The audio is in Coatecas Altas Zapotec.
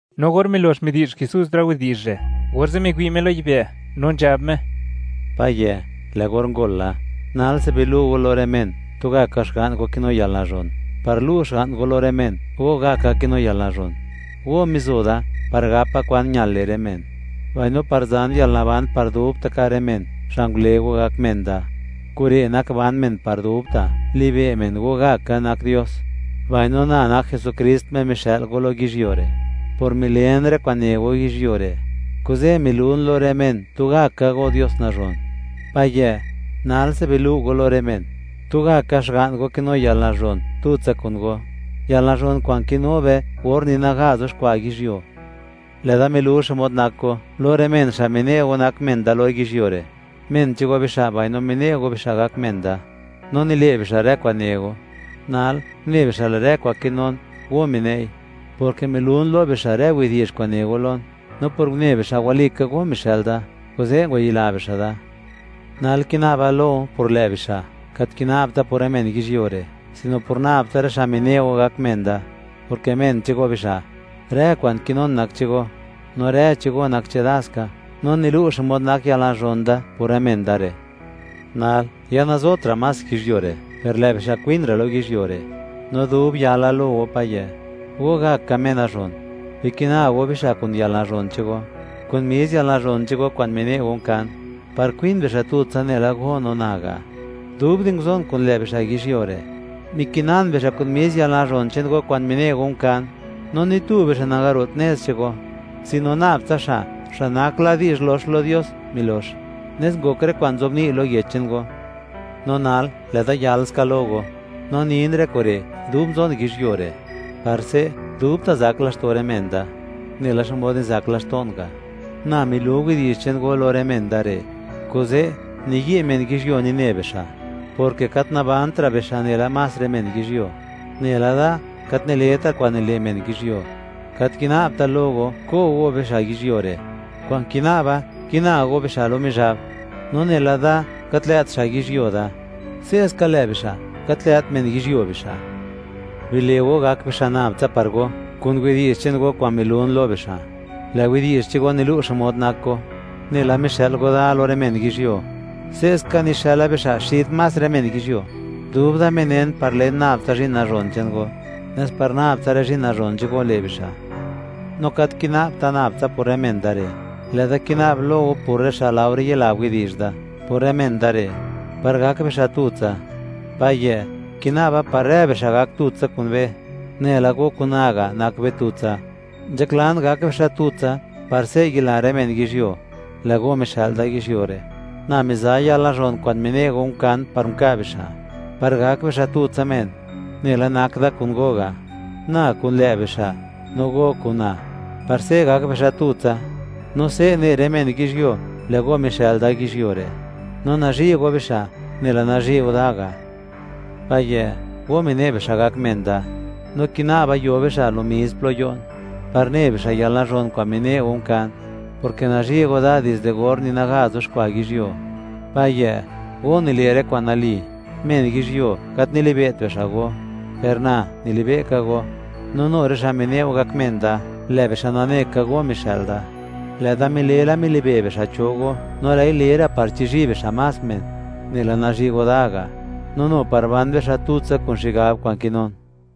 No or milox midi'zh Jesús rë widi'zh re', orze' miwi' Me lo yibë' no nzhab Me: ―Payë', lë' or ngol la: Nalse bilu' Go lo rë men tugaka Xga'n go kinu yalnazhon, par lu' Xga'n go lo rë men, Go gaka kinu yalnazhon. Go mizo Da par gapa kwan ñal le' rë men, mbaino par zan yalnaban par dubta' ka' rë men, xa' ngule Go gak men Da. Kure' nak ban men par dubta'; libe' men, Go gaka nak Dios, mbaino na, nak Jesukrist, Me mixë'l Go lo yizhyuo re'. ’Por milen rë kwa'n ne Go yizhyuo re', kuze' milun lo rë men, tugaka Go Dios nazhon. Payë', nalse bilu' Go lo rë men, tugaka Xga'n Go kinu yalnazhon tutsa kun Go, yalnazhon kwa'n kinu be or ni naga zuxkwa' yizhyuo. ’Lë'da milu xmod nak Go lo rë men xa' mine' Go nak men Da lo yizhyuo re'; men che'n Go bixa' mbaino mine' Go bixa' gak men da, no nile' bixa' rë kwa'n ne Go. Nal une bixa' lë' rë kwa'n kinun, Go mine'i; porke milun lo bixa' rë widi'zh kwa'n ne Go lon. No por une bixa', walika Go mixë'l Da, kuze' ngwayila bixa' Da. ’Nal kina'ba lo Go por lë' bixa'; gat nina'bta por rë men yizhyuo re', sino por nab tsa rë xa' mine' Go gak men Da, porke men che'n Go bixa'. Rë kwa'n kinun nak che'n Go, no rë che'n Go nak chedaska; no nilu' xmod nak yalnazhon da por rë men da re'. ’Nal ya nazotra' más yizhyuo re', per lë' bixa' kwin ra' lo yizhyuo re'. No dub yala lo Go Payë', Go gaka Me Nazhon, bikina Go bixa' kun yalnazhon che'n Go, kun mis yalnazhon che'n Go kwa'n mine' Go unkan, par kwin bixa' tutsa nela Go no na ga'. Dub di nguzon kun lë' bixa' yizhyuo re', mikinan bixa' kun mis yalnazhon che'n Go kwa'n mine' Go unkan, no ni tu bixa' nangaro't nez che'n Go, sino nab tsa xa', xa' nak la di'zh lox lo Dios, milox; nes ngok rë kwa'n nzobni' lo Yech che'n Go. ’No nal, lë'da yal ska lo Go, no nin rë kure' dub nzon yizhyuo re', par se' dubta' zak laxto' rë men da, nela xmod nizak laxto'n ga'. Na milu widi'zh che'n Go lo rë men Da re', kuze' niyi' men yizhyuo nine bixa', porke gat nikizëtra' bixa' nela más rë men yizhyuo, nela Da, gat nileta kwa'n nile' men yizhyuo. Gat kina'bta' lo Go, ko' Go bixa' yizhyuo re'; kwa'n kina'ba kina Go bixa' lo Mizhab. No nela Da gat lë't xa' yizhyuo Da, se'ska lë' bixa' gat lë't men yizhyuo bixa'. Bile' Go gak bixa' nab tsa par Go kun widi'zh che'n Go kwa'n milun lo bixa'; lë' widi'zh che'n Go nilu' xmod nak Go. Nela mixë'l Go da lo rë men yizhyuo, se'ska nixëla bixa' xid más rë men yizhyuo. Dub Da minen par len nab tsa zhi'n nazhon che'n Go, nes par nab tsa rë zhi'n nazhon che'n Go le' bixa'. No gat kina'bta' nab tsa por rë men da re'; lë'da kina'b lo Go por rë xa' laore yila widi'zh da por rë men da re', par gak bixa' tutsa. Payë', kina'ba par rë bixa' gak tutsa kun be, nela Go kun na ga' nak be tutsa. Nzhaklan gak bixa' tutsa, par se' yila rë men yizhyuo, lë' Go mixë'l da yizhyuo re'. Na miza yalnazhon kwa'n mine' Go unkan, par nka' bixa', par gak bixa' tutsa men, nela nak da kun Go ga'; na kun lë' bixa', no Go kun na, par se' gak bixa' tutsa, no se' ne rë men yizhyuo, lë' Go mixë'l da yizhyuo re', no nazhi' Go bixa' nela nazhi' Go da ga'. ’Payë', Go mine' bixa' gak men Da, no kina'ba yo bixa' lomis plo yo'n, par ne bixa' yalnazhon kwa'n mine' Go unkan, porke nazhi' Go da dizde or ni naga yuxkwa' yizhyuo. Payë', Go nile' rë kwa'n nali; men yizhyuo, gat nilibe't bixa' Go, per na nilibe'ka Go, no nu rë xa' mine' Go gak men Da, lë' bixa' nane ka, Go mixë'l da. Lë'da mile la, milibe' bixa' cho Go, no lë'i le ra', par chizhi' bixa' más men nela nazhi' Go da ga', no nu par ban bixa' tutsa kun xigab kwa'n kinun.